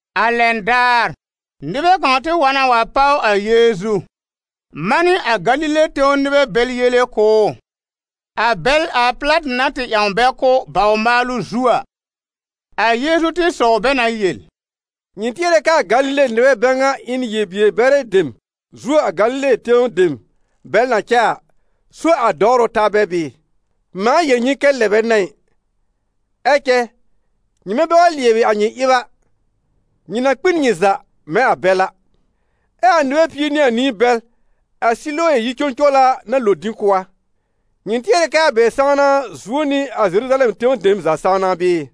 A lɛn daar, nɩbɛ kãw tɩ wa na wa páw a Yeezu, manɩ a Galile tẽw nɩbɛ bɛl yele kʋ̀ ʋ, a bɛl a Pɩlatɩ na tɩ ƴãw bɛ kʋ́ bawr-maalʋ zu a. A Yeezu tɩ sɔw bɛ na yel: «Nyɩ tɩɛrɛ kɛ a Galile nɩbɛ bɛ ŋa ɩ n yel-bier-bɛrɛ dem zuo a Galile tẽw dem bɛl na cɛ a, so a dɔwrʋ ta bɛ bɩɩ? Mãa yel nyɩ kɛ lɛ bɛ n'a ɩ. Ɛ cɛ nyɩmɛ bɛ wa lɩɛbɩ a nyɩ ɩb a, nyɩ na kpi n nyɩ za mɛ̃ a bɛl a. Ɛ a nɩbɛ pie nɩ anĩ bɛl a Silowe yi-cõcowla na lo dĩ kʋ́ a, nyɩ tɩɛrɛ kɛ a bɛ sãwna zuo nɩ a Zeruzalɛm tẽw dem za sãwna bɩɩ?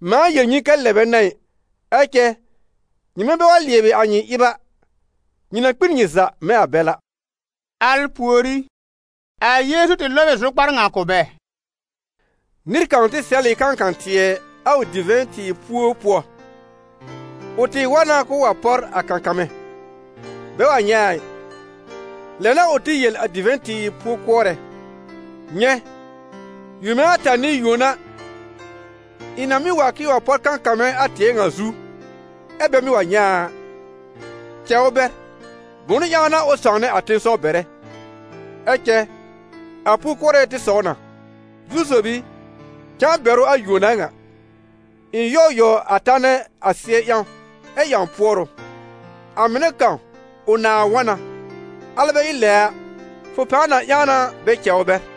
Mãa yel nyɩ kɛ lɛ bɛ n'a ɩ. Ɛ cɛ nyɩmɛ bɛ wa lɩɛbɩ a nyɩ ɩb a, nyɩ na kpi n nyɩ za mɛ̃ a bɛl a.» Al pùorí, a Yeezu tɩ lɔb ɩ zʋkpar ŋa kʋ̀ bɛ: «Nɩr kãw tɩ sɛl ɩ kãkã-tɩɛ a ʋ divɛ̃-tɩɩr puo pʋɔ. Ʋ tɩ wa na k'ʋʋ wa pɔr a kãkãmɛ̃, bɛ wa nyɛ̃ a ɩ. Lɛ n'a ʋ tɩ yel a divɛ̃-tɩɩr po-kʋɔrɛ: ‹Nyɛ̃! yome ata n'ɩ yuona, ɩ̃ na mɩ́ wa k'ɩ̃ɩ wa pɔr kãkãmɛ̃ a tɩɛ ŋa zu, ɛ bɛ mɩ́ wa nyɛ̃ a a. Cɛ ʋ bɛr, bʋ̃ʋ ƴãw n'a ʋ sãwnɛ a tẽsɔw bɛrɛ?› Ɛ cɛ a po-kʋɔrɛ tɩ sɔw na: ‹Zu-sob i, cãa bɛr ʋ a yuon ŋa, ɩ̃ yɔ̀w yɔ̀w a tanɛ a sɩɛ ƴãw ɛ ƴãw pʋɔrʋ. A mɩnɛ kãw ʋ nãa wɔ̃ na, alɛ bɛ ɩ lɛ a, fʋ pãa na ƴãw na bɛ cɛ ʋ bɛr.›»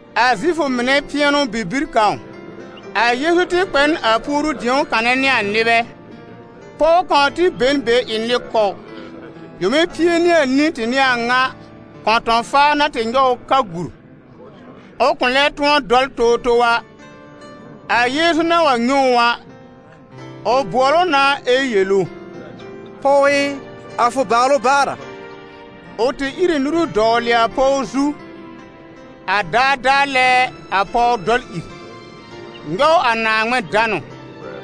A Zifʋ mɩnɛ pɩɛnʋ-bibir kãw, a Yeezu tɩ kpɛ n a puoru-dĩ̀o kanɛ nɩ a nɩbɛ. Pɔw kãw tɩ be n a be ɩ nɩ-kɔw: yome pie nɩ anĩ tɩ n'ɩ a ŋa, kɔ̃tɔ̃-faa na tɩ nyɔw ʋ ka gur, ʋ kʋ̃ lɛ tʋ̃ɔ dɔl towtow a. A Yeezu na wa nyɛ̃ ʋ a, ʋ bʋɔl ʋ na ɛ yel ʋ: «Pɔw ɩ, a fʋ bàalʋ baar a.» Ʋ tɩ ír ɩ nuru dɔwlɩ a pɔw zu, a daadaa lɛ a pɔw dɔl ìr, nyɔw a Naaŋmɩn danʋ.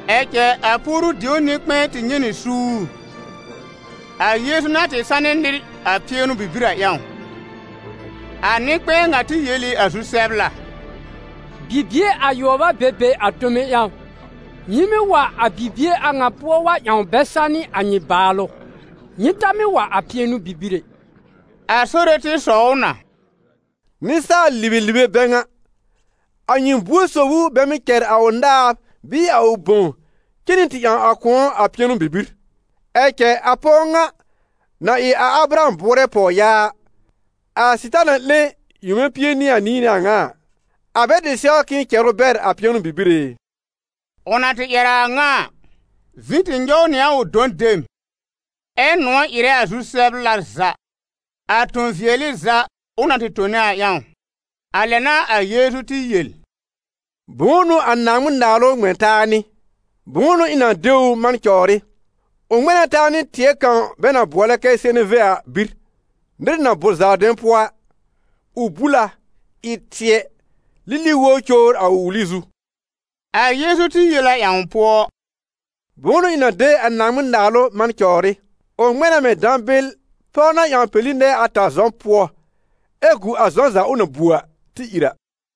Ɛ cɛ a puoru-dĩo nɩ-kpɛ̃ɛ tɩ nyɛ̃ nɩ suur, a Yeezu na tɩ sanɩ nɩr a pɩɛnʋ-bibir a ƴãw. A nɩ-kpɛ̃ɛ ŋa tɩ yel ɩ a zu-sɛbla: «Bibie ayʋɔb a be be a tome ƴãw, nyɩ mɩ́ wa a bibie a ŋa pʋɔ wa ƴãw bɛ sanɩ a nyɩ bàalʋ. Nyɩ ta mɩ́ wa a pɩɛnʋ-bibir ɛ.» A Sore tɩ sɔw ʋ na: «Nɩsaal-libelibe bɛ ŋa! A nyɩ buor sob ʋ bɛ mɩ́ cɛr a ʋ naab bɩɩ a ʋ bõw cen nɩ tɩ ƴãw a kʋ̃ɔ a pɩɛnʋ-bibir? Ɛ cɛ a pɔw ŋa, na ɩ a Abraham bʋʋrɛ pɔwyaa, a Sɩtaana 'lẽ yome pie nɩ anĩ n'ɩ a ŋa a, a bɛ tɩ sɛw k'ɩ̃ɩ cɛr ʋ bɛr a pɩɛnʋ-bibir ɛ?» Ʋ na tɩ ƴɛr a a ŋa a, vĩ tɩ nyɔw nɩ a ʋ dɔ̃ dem, ɛ́ nʋ̃ɔ̀ ɩrɛ a zu-sɛbla za, a tõ-vɩɛlɩ za ʋ na tɩ tone a ƴãw. A lɛ n'a a Yeezu tɩ yel: «Bʋ̃ʋ n'ʋ a Naaŋmɩn-Naalʋ ŋmɛ̃ taa nɩ? Bʋ̃ʋ n'ʋ ɩ̃ na de ʋ man cɔwr ɩ? Ʋ ŋmɛ̃ na taa nɩ tɩɛ kãw bɛ na bʋɔlɛ kɛ seneve a bir, nɩr na bʋ̀r zaardɛ̃ pʋɔ a; ʋ bul a, ɩ tɩɛ, lili wobr cowr a ʋ wuli zu.» A Yeezu tɩ yel a ƴãw pʋɔ: «Bʋ̃ʋ n'ʋ ɩ̃ na de a Naaŋmɩn-Naalʋ man cɔwr ɩ? Ʋ ŋmɛ̃ na mɛ̃ dãbɩl pɔw na ƴãw peli nɛɛ ata zɔ̃ pʋɔ, ɛ gu a zɔ̃ za ʋ na bu a tɩ ìr a.»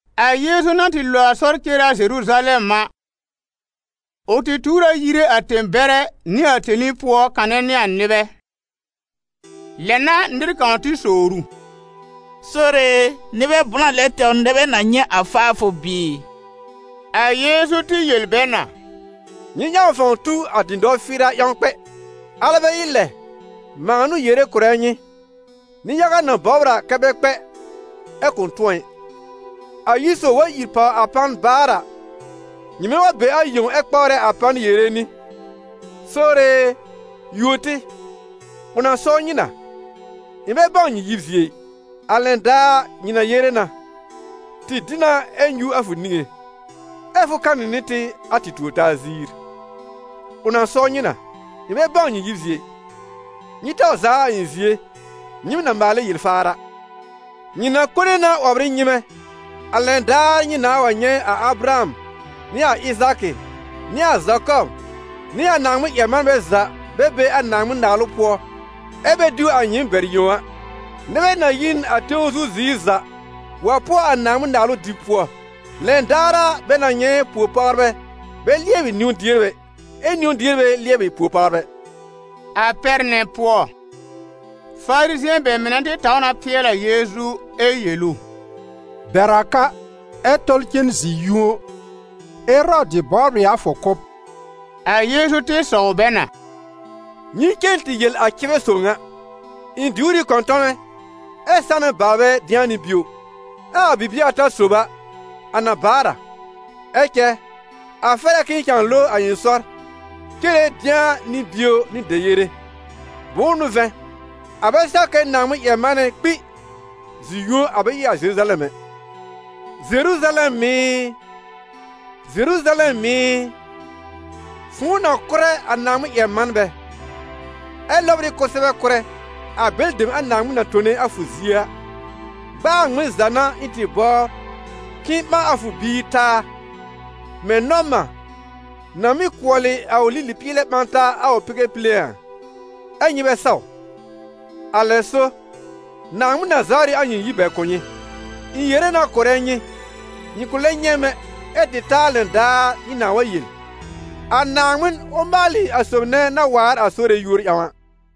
A Yeezu na tɩ lo a sɔr cere a Zeruzalɛm a, ʋ tɩ tuur a yire a tẽ-bɛrɛ nɩ a tẽli pʋɔ kanɛ nɩ a nɩbɛ. Lɛ n'a nɩr kãw tɩ sowr ʋ: «Sore e, nɩbɛ blã lɛ tɛwr nɛ bɛ na nyɛ̃ a faafʋ bɩɩ?» A Yeezu tɩ yel bɛ na: «Nyɩ ƴãw fãw tu a dɩ̃dɔ-fɩɩra ƴãw kpɛ, alɛ bɛ ɩ lɛ, mãa n'ʋ yere kʋ̀rɛ nyɩ: nɩ-yaga na bɔbr a kɛ bɛ kpɛ, ɛ kʋ̃ tʋ̃ɔ ɩ.» «A yir sob wa ìr pàw a pan baar a, nyɩmɛ wa be a yẽw ɛ kpawrɛ a pan yere nɩ: ‹Sore e, yuo tɩ›, ʋ na sɔw nyɩ na: ‹Ɩ̃ bɛ bãw nyɩ yib zie ɩ.› A lɛn daar, nyɩ na yere na: ‹Tɩ dɩ na ɛ nyũ a fʋ niŋé, ɛ́ fʋ kanɩ nɩ tɩ a tɩ tuor-taa ziir.› Ʋ na sɔw nyɩ na: ‹Ɩ̃ bɛ bãw nyɩ yib zie ɩ, nyɩ taw zaa a ɩ̃ zie, nyɩɩm na maalɛ yel-faar a.› Nyɩ na kone na 'wɔbr ɩ nyɩmɛ, a lɛn daar nyɩ nãa wa nyɛ̃ a Abraham nɩ a Ɩzaakɩ nɩ a Zakɔb nɩ a Naaŋmɩn-ƴɛr-manbɛ za bɛ be a Naaŋmɩn-Naalʋ pʋɔ, ɛ́ bɛ diw a nyɩɩm bɛr yẽw a. Nɩbɛ na yi n a tẽw zu ziir za wa pʋɔ a Naaŋmɩn-Naalʋ dɩb pʋɔ. Lɛn daar a, bɛ na nyɛ̃ po-pawrbɛ bɛ lɩɛbɩ niwn-dierbɛ ɛ niwn-dierbɛ lɩɛbɩ po-pawrbɛ.» A pɛr nɛ pʋɔ, Farizɩ̃ɛ bɛ mɩnɛ tɩ taw na pɩɛl a Yeezu ɛ yel ʋ: «Bɛr a ka, ɛ tɔl cen zi-yũo, Erɔdɩ bɔbr ɩ a fʋ kʋ́b.» A Yeezu tɩ sɔw bɛ na: «Nyɩ cen tɩ yel a cɩbɛ sob ŋa: ‹Ɩ̃ diwr ɩ kɔ̃tɔmɛ ɛ sanɛ baalbɛ dɩ̃a nɩ bio, ɛ a bibie ata sob a, a na baar a.› Ɛ cɛ a fɛr a k'ɩ̃ɩ cãa lo a ɩ̃ sɔr cere dɩ̃a nɩ bio nɩ deyere, bʋ̃ʋ n'ʋ vɛ̃, a bɛ sɛw kɛ Naaŋmɩn-ƴɛr-manɛ kpi zi-yũo a bɛ ɩ a Zeruzalɛm ɛ. Zeruzalɛm ɩ! Zeruzalɛm ɩ! Fʋ̃ʋ na kʋ́rɛ a Naaŋmɩn-ƴɛr-manbɛ, ɛ lɔbr ɩ kʋsɛbɛ kʋ́rɛ a bɛlɩ dem a Naaŋmɩn na tone a fʋ zie a! Gb'aa a ŋmɩn za n'a ɩ̃ tɩ bɔbr k'ɩ̃ɩ ɓã a fʋ biir taa, mɛ̃ nɔ̃-mã na mɩ́ kʋɔlɩ a ʋ lili-pɩɩlɛ ɓã taa a ʋ bɩgɛ pile a, ɛ́ nyɩ bɛ saw! Alɛ so, Naaŋmɩn na zawr ɩ a nyɩ yir bɛr kʋ̀ nyɩ. Ɛ ɩ̃ yere na kʋ̀rɛ nyɩ, nyɩ kʋ̃ lɛb nyɛ̃ m ɛ tɩ ta a lɛn daar nyɩ nãà wa yel: ‹A Naaŋmɩn, ʋ maalɩ a sob nɛ na waar a Sore yúor ƴãw a!›»